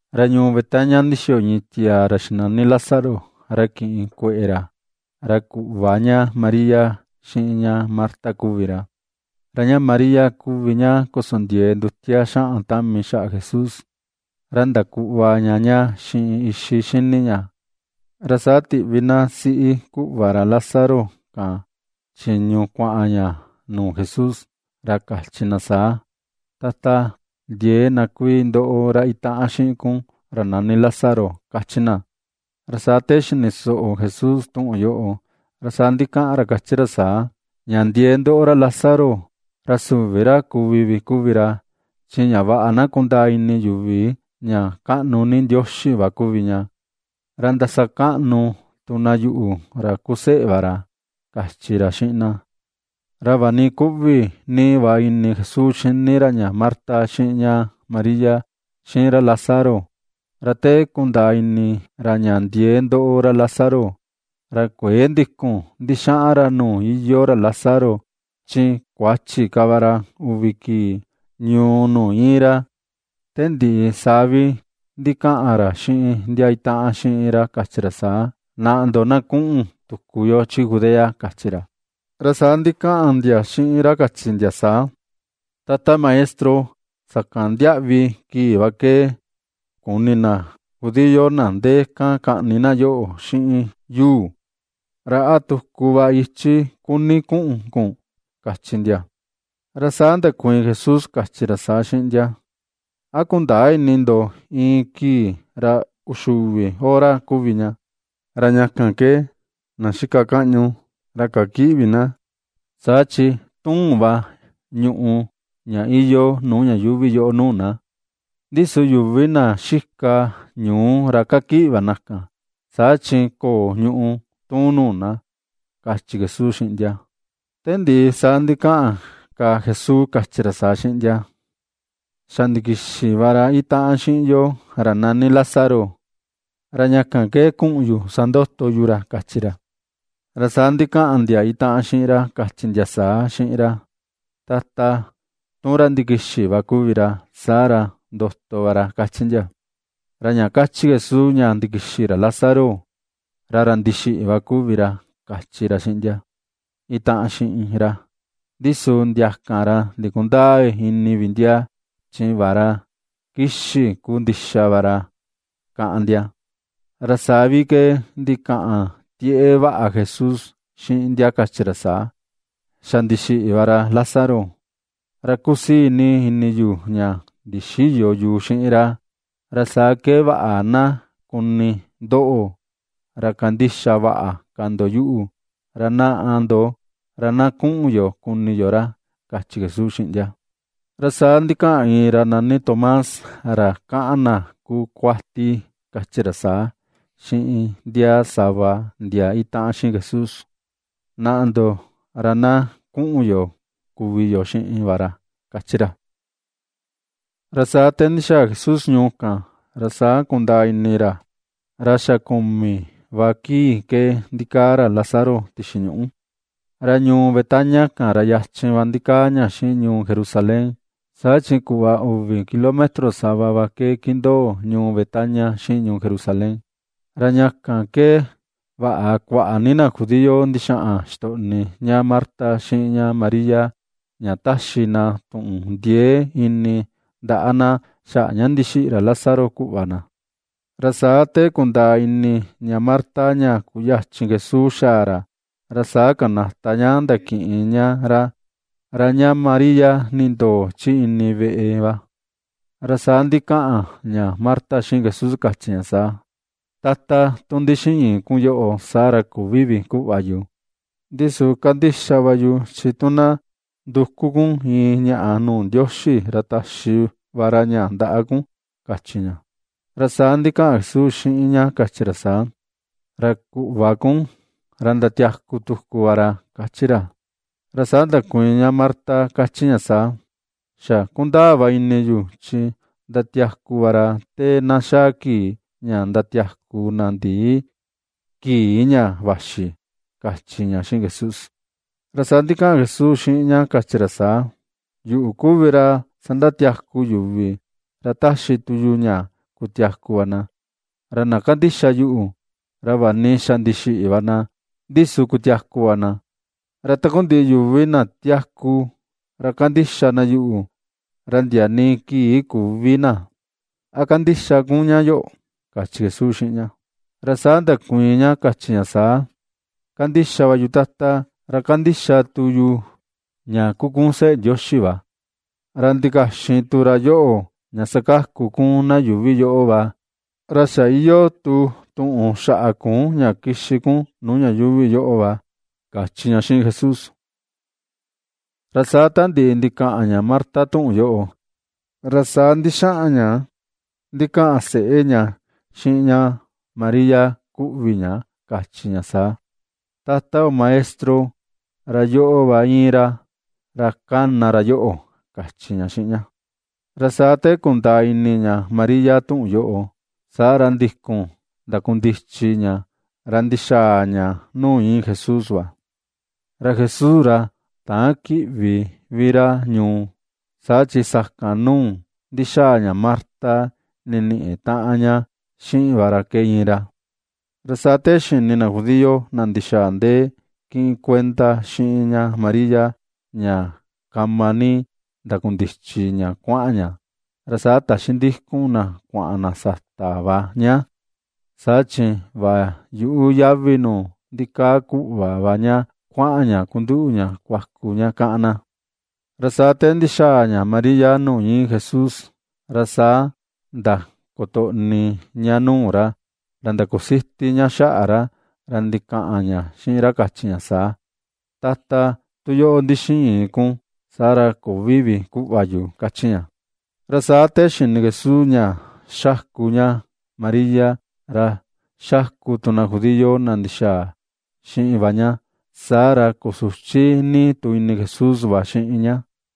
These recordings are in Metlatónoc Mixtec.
Ra ñuu Betania ndixiyo iin tiaa ra xinani Lázaro ra kiꞌin kueꞌe ra, ra kuꞌva ña María, xiꞌin ña Marta kuvi ra. Ra ña María, kuvi ña kosondiee ndutia xaꞌan tami xaꞌa Jesús, ra ndakuꞌva ña ña xiꞌin ixi xini ña. Ra saa tiꞌvi na siꞌi kuꞌva ra Lázaro kan, chiñu kuaꞌan ña nuu Jesús, ra kachi na saa: ―Tata, ndiee na kuii ndoꞌo ra itaꞌan xiꞌin kun, ra nani Lázaro ―kachi na. Ra saa te xini soꞌo Jesús tuꞌun yoꞌo, ra saa ndikaꞌan ra kachi ra saa: ―Ña ndiee ndoꞌo ra Lázaro, ra süvi ra kuvi vi kuvi ra, chi ña vaꞌa na kundaa ini yuvi ña kaꞌnu ni Ndioxi va kuvi ña, ra ndasakaꞌnu tu na yuꞌu, ra kuu seꞌe va ra ―kachi ra xiꞌin na. Ra vaꞌa ni kuꞌvi ni va ini Jesús xini ra ña Marta, xiꞌin ña María, xiꞌin ra Lázaro, ra te kundaa ini ra ña ndiee ndoꞌo ra Lázaro, ra kuëe ndikun ndixaꞌan ra nuu iyoo ra Lázaro, chi kuachi ka va ra uvi kii ñuu nuu íin ra. Te ndiꞌi saa vi ndikaꞌan ra xiꞌin ndia itaꞌan xiꞌin ra kachi ra saa: ―Naꞌa ndo na kuꞌun tuku yo chi Judea ―kachi ra. Ra saa ndikaꞌan ndia xiꞌin ra kachi ndia saa: ―Tata Maestro, sakan ndiaꞌvi kii va ke kuni na judío na ndee kan kaꞌni na yoꞌo xiꞌin yuu, ¿ra a tuku va ichi kuni kuꞌun kun? ―kachi ndia. Ra saa ndakuiin Jesús, kachi ra saa xiꞌin ndia: ―¿A kundäa ini ndo iin kii, ra uxi uvi hora kuvi ña? Ra ña kan ke na xika kaꞌñu ra kakïꞌi vi na, saa chi tuun va ñùꞌù ña iyoo nuu ña yuuvi yoꞌo nuu na. Ndi su yuvi na xika ñuu, ra kakiꞌi va na kan, saa chi köo ñùꞌù tuun nuu na ―kachi Jesús xiꞌin ndia. Te ndiꞌi saa ndikaꞌan ka Jesús kachi ra saa xiꞌin ndia: ―Xa ndikixi va ra itaꞌan xiꞌin yo, ra nani Lázaro; ra ña kan ke kuꞌun yu sandoto yu ra ―kachi ra. Ra saa ndikaꞌan ndia itaꞌan xiꞌin ra, kachi ndia saa xiꞌin ra: ―Tata, tu ra ndikixi va kuvi ra, saa ra ndoto va ra ―kachi ndia. Ra ña kachi Jesús ña ndikixi ra Lázaro, ra ra ndixiꞌi va kuvi ra, kachi ra xiꞌin ndia itaꞌan xiꞌin ra, ndi su ndia kan ra ndikundäa ini vi ndia, chi vaꞌa ra kixi ku ndixa va ra káꞌán ndia. Ra saa vi ke ndikaꞌan tieꞌe vaꞌa Jesús, xiꞌin ndia kachi ra saa: ―Xa ndixiꞌi va ra Lázaro. Ra kusii ni ini yu ña ndixïyo yu xiꞌin ra, ra saa ke vaꞌa na kuni ndoꞌo, ra kandixa vaꞌa ka ndo yuꞌu, ra naꞌa ndo, ra na kuꞌun yo kuni yo ra ―kachi Jesús xiꞌin ndia. Ra saa ndikaꞌan iin ra nani Tomás, ra kaꞌan na kuu kuati kachi ra saa, xiꞌin ndia sava ndia itaꞌan xiꞌin Jesús: ―Naꞌa ndo, ra na kuꞌun yo kuvi yo xiꞌin va ra ―kachi ra. Ra saa te ndixaa Jesús ñuu kan, ra saa kundaa ini ra ra xa kumi va kii ke ndikaa ra Lázaro tixi ñuꞌu. Ra ñuu Betania kan, ra yachin va ndikaa ña xiꞌin ñuu Jerusalén, saa chi kuꞌva uvi kilómetro sava va ke kindoo ñuu Betania xiꞌin ñuu Jerusalén. Ra ña kan ke vaꞌa kuaꞌa ni na judío ndixaꞌan ixtoꞌni ña Marta xiꞌin ña María, ña ^taxi na tuꞌun ndiee ini ndaꞌa na, xaꞌa ña ndixiꞌi ra Lázaro kuꞌva na. Ra saa te kundaa ini ña Marta ña kuyachin Jesús xaa ra, ra saa kanata ña ndakiꞌin ña ra; ra ña María, nindoo chi ini veꞌe va. Ra saa ndikaꞌan ña Marta xiꞌin Jesús, kachi ña saa: ―Tata, tu ndixiin kun yoꞌo, saa ra küvi vi kuꞌva yu. Ndi su kandixa va yu chi tu na nduku kun iin ñaꞌa nuu Ndioxi ra taxi va ra ña ndaꞌa kun ―kachi ña. Ra saa ndikaꞌan Jesús xiꞌin ña kachi ra saa: ―Ra kuꞌva kun, ra ndatiaku tuku va ra ―kachi ra. Ra saa ndakuiin ña Marta kachi ña saa: ―Xa kundaa va ini yu, chi ndatiaku va ra te na xaa kii ña ndatiaku na ndii kii ña vaxi ―kachi ña xiꞌin Jesús. Saa ndikaꞌan Jesús xiꞌin ña kachi ra saa: ―Yuꞌu kuvi ra sandatiaku yuvi, ra taxi tu yu ña kutiaku va na. Ra na kandixa yuꞌu, ra vaꞌa ni xa ndixiꞌi va na, ndi su kutiaku va na. Ra takundiꞌi yuvi na tiaku, ra kandixa na yuꞌu, ra ndia nii kii küvi na. ¿A kandixa kun ña yoꞌo? ―kachi Jesús xiꞌin ña. Ra saa ndakuiin ña kachi ña saa: ―Kandixa va yu, Tata, ra kandixa tu yu, ña kuu kun Seꞌe Ndioxi va, ra ndikaxin tu ra yoꞌo ña sakaku kun na yuuvi yoꞌo va, ra xa iyoo tu tuꞌun xaꞌa kun ña kixi kun nuu ña yuuvi yoꞌo va ―kachi ña xiꞌin Jesús. Ra saa ta ndiꞌi ndikaꞌan ña Marta tuꞌun yoꞌo, ra saa ndixaꞌan ña ndikaꞌan seꞌe ña xiꞌin ña María kuꞌvi ña, kachi ña saa: ―Tata yo Maestro, ra yoꞌo va íin ra, ra kana ra yoꞌo ―kachi ña xiꞌin ña. Ra saa te kundaa ini ña María tuꞌun yoꞌo, saa ra ndikun ndakundichi ña, ra ndixaa ña nuu íin Jesús va. Ra Jesús ra täan kiꞌvi vi ra ñuu, saa chi sakan nuu ndixaa ña Marta niniꞌi taꞌan ña xiꞌin va ra ke íin ra. Ra saa te xini na judío na ndixaa ndee kiꞌin kuenda xiꞌin ña Maria, ña kama ni ndakundichi ña kuaꞌan ña, ra saa taxi ndikun na kuaꞌan na sata va ña, saa chi vaꞌa yuꞌu yavi nuu ndikaa kuꞌva va ña kuaꞌan ña kunduꞌu ña kuaku ña, káꞌán na. Ra saa te ndixaa ña María nuu íin Jesús, ra saa ndakutoꞌni ña nuu ra, ra ndakusiti ña xaꞌa ra, ra ndikaꞌan ña xiꞌin ra kachi ña saa: ―Tata, tu yoꞌo ndixiin kun, saa ra küvi vi kuꞌva yu ―kachi ña. Ra saa te xini Jesús ña ^xaku ña Maria, ra xaku tu na judío na ndixaa xiꞌin va ña, saa ra kusuchi ni tu ini Jesús va xiꞌin ña.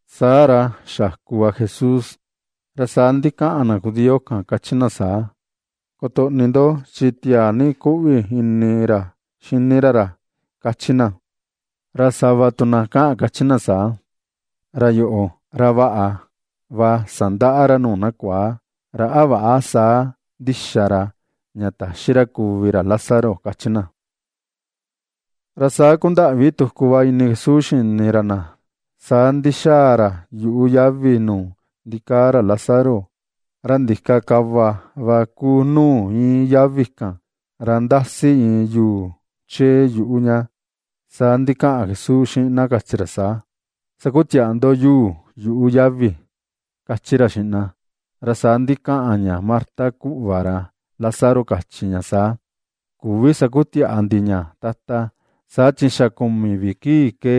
Saa ra xaku va Jesús. Ra saa ndikaꞌan na judío kan, kachi na saa: ―Kutoꞌni ndo, chi tiaa ni kuꞌvi ini ra xini ra ra ―kachi na. Ra sava tu na kaꞌan kachi saa: ―Ra yoꞌo, ra vaꞌa va sandaꞌa ra nuu na kuaa, ¿ra a väꞌa saa ndixa ra, ña täxi kuvi ra Lázaro? ―kachi na. Saa kundaꞌvi tuku va ini Jesús xini ra na, saa ndixaa ra yuꞌu yavi nuu ndikaa ra Lázaro, ra ndika kava va ku nuu íin yavi kan, ra ndasi iin yuu chee yuꞌu ña. Saa ndikaꞌan Jesús xiꞌin na kachi ra saa: ―Sakutiaꞌa ndo yuu yuꞌu yavi ―kachi ra xiꞌin na. Ra saa ndikaꞌan ña Marta kuꞌva ra Lázaro kachi ña saa: ―Küvi sakutiaꞌa ndi ña, Tata, saa chi xa kumi vi kii ke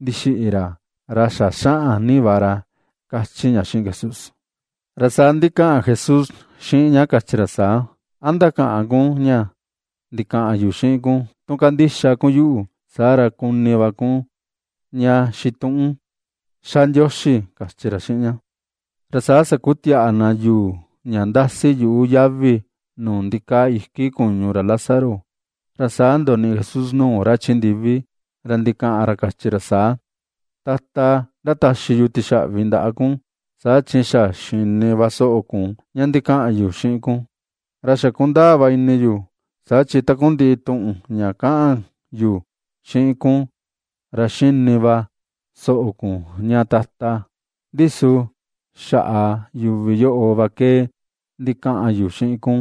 ndixiꞌi ra, ra xa xaꞌan ni va ra ―kachi ña xiꞌin Jesús. Ra saa ndikaꞌan Jesús xiꞌin ña kachi ra saa: ―¿A ndakäꞌan kun ña ndikaꞌan yu xiꞌin kun, tu kandixa kun yuꞌu, saa ra kuni va kun ña xituꞌun ^xa Ndioxi? ―kachi ra xiꞌin ña. Ra saa sakutiaꞌa na yuu ña ndasi yuꞌu yavi nuu ndikaa iki kuñu ra Lázaro, ra saa ndoniꞌi Jesús nuu ra chi ndivi, ra ndikaꞌan ra kachi ra saa: ―Tata, ndataxi yu tixaꞌvi ndaꞌa kun, saa chi xa xini va soꞌo kun ña ndikaꞌan yu xiꞌin kun. Ra xa kundaa va ini yu, saa chi takundiꞌi tuꞌun ña kaꞌan yu xiꞌin kun ra ^xini va soꞌo kun ña Tata, ndi su xaꞌa yuvi yoꞌo va ke ndikaꞌan yu xiꞌin kun,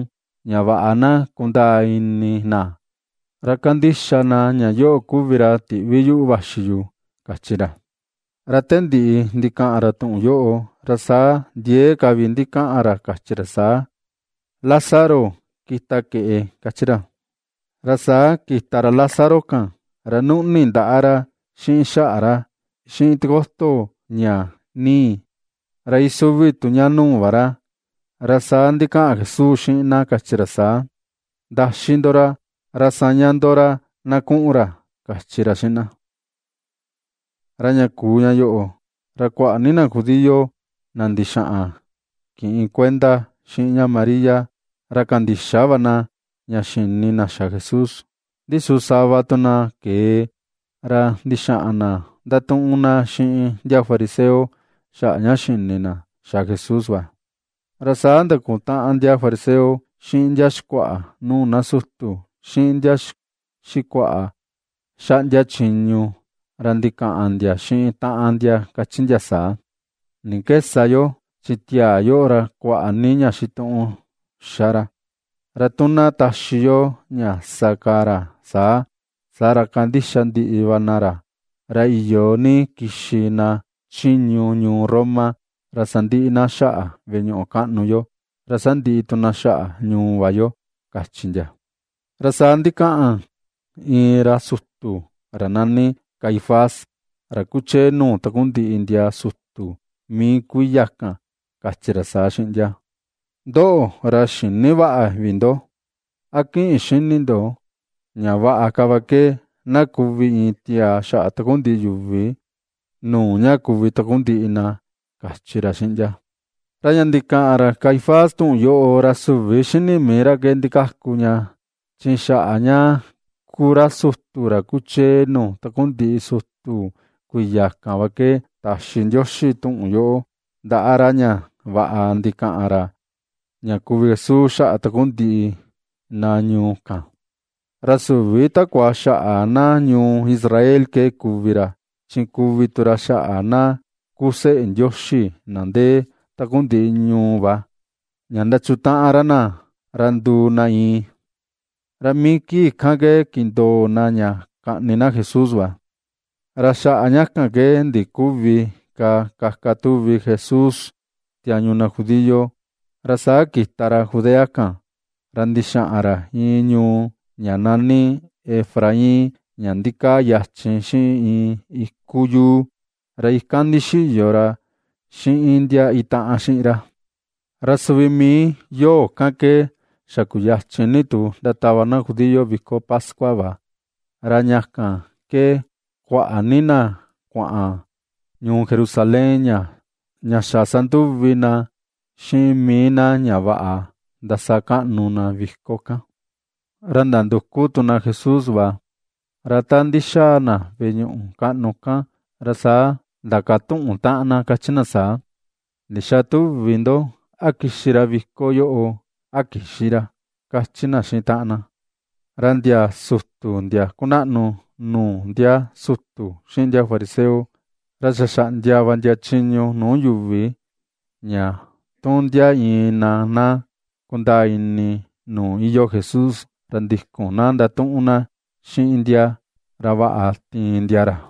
ña vaꞌa na kundaa ini na, ra kandixa na ña yoꞌo kuvi ra tiꞌvi yuꞌu vaxi yu ―kachi ra. Ra te ndiꞌi ndikaꞌan ra tuꞌun yoꞌo, ra saa ndiee ka vi ndikaꞌan ra kachi ra saa: ―¡Lázaro, kita keꞌe! ―kachi ra. Ra saa kita ra Lázaro kan, ra nuꞌni ndaꞌa ra, xiꞌin xaꞌa ra, xiꞌin tikoto ña nii, ra isuvi tu ña nuu va ra. Ra saa ndikaꞌan Jesús xiꞌin na, kachi ra saa: ―Ndaxi ndo ra, ra saña ndo ra na kuꞌun ra ―kachi ra xiꞌin na. Ra ña kuu ña yoꞌo, ra kuaꞌa ni na judío na ndixaꞌan kiꞌin kuenda xiꞌin ña María ra kandixa va na, ña xini na xa Jesús. Ndi su sava tu na kee, ra ndixaꞌan na ndatuꞌun na xiꞌin ndia fariseo, xaꞌa ña xini na xa Jesús va. Ra saa ndakutaꞌan ndia fariseo xiꞌin ndia xikuaꞌa nuu na sutu, xiꞌin ndia xikuaꞌa xaꞌndia chiñu, ra ndikaꞌan ndia xiꞌin taꞌan ndia kachi ndia saa: ―¿Ni ke sa yo? Chi tiaa yoꞌo, ra kuaꞌa ni ña xituꞌun ^xa ra. Ra tu na taxi yo ña sa ka ra saa, saa ra kandixa ndiꞌi va na ra, ra iyo ni kixi na chiñu ñuu Roma, ra sandiꞌi na xaꞌa veꞌe ñuꞌu kaꞌnu yo, ra sandiꞌi tu na xaꞌa ñuu va yo ―kachi ndia. Ra saa ndikaꞌan iin ra sutu ra nani Caifás, ra kuchee nuu takundiꞌi ndia sutu mii kuiya kan, kachi ra saa xiꞌin ndia: ―Ndoꞌo, ra xïni vaꞌa vi ndo. ¿A kïꞌin xini ndo, ña vaꞌa ka va ke na kuvi iin tiaa xaꞌa takundiꞌi yuvi, nuu ña kuvi takundiꞌi na ―kachi ra xiꞌin ndia. Ra ña ndikaꞌan ra Caifás tuꞌun yoꞌo, ra süvi xini mii ra ke ndikaku ña, chi xaꞌa ña kuu ra sutu, ra kuchee nuu takundiꞌi sutu kuiya kan va ke taxi Ndioxi tuꞌun yoꞌo ndaꞌa ra, ña vaꞌa ndikaꞌan ra, ña kuvi Jesús xaꞌa takundiꞌi na ñuu kan; ra süvi takua xaꞌa na ñuu Israel ke kuvi ra, chi kuvi tu ra xaꞌa na kuu seꞌe Ndioxi na ndee takundiꞌi ñuu va, ña ndachutaꞌan ra na, ra nduu na iin. Ra mii kii kan ke, kindoo na ña kaꞌni na Jesús va. Ra xaꞌa ña kan ke ndiküvi ka kaka tuvi Jesús tiañu na judío, ra saa kita ra Judea kan, ra ndixaꞌan ra iin ñuu ña nani Efraín ña ndikaa yachin xiꞌin iin iku yuu. Ra ikan ndixiyo ra xiꞌin ndia itaꞌan xiꞌin ra. Ra suvi mii yoo kan ke, xa kuyachin ni tu ndatava na judío viko pascua va, ra ña kan ke kuaꞌa ni na kuaꞌan ñuu Jerusalén, ña xa sanduvi na xiꞌin mii na ña vaꞌa ndasakaꞌnu na viko kan. Ra ndanduku tu na Jesús va, ra ta ndixaa na veꞌe ñuꞌu kaꞌnu kan, ra saa ^ndakatuꞌun taꞌan na kachi na saa: ―¿Ndixa tuvi ndo, a kixi ra viko yoꞌo a kïxi ra? ―kachi na xiꞌin taꞌan na. Ra ndia sutu ndia kunaꞌnu nuu ndia sutu xiꞌin ndia fariseo, ra xa xaꞌndia va ndia chiñu nuu yuvi, ña tu ndia iin na na kundaa ini nuu iyoo Jesús, ra ndikun na ndatuꞌun na xiꞌin ndia, ra vaꞌa tiin ndia ra.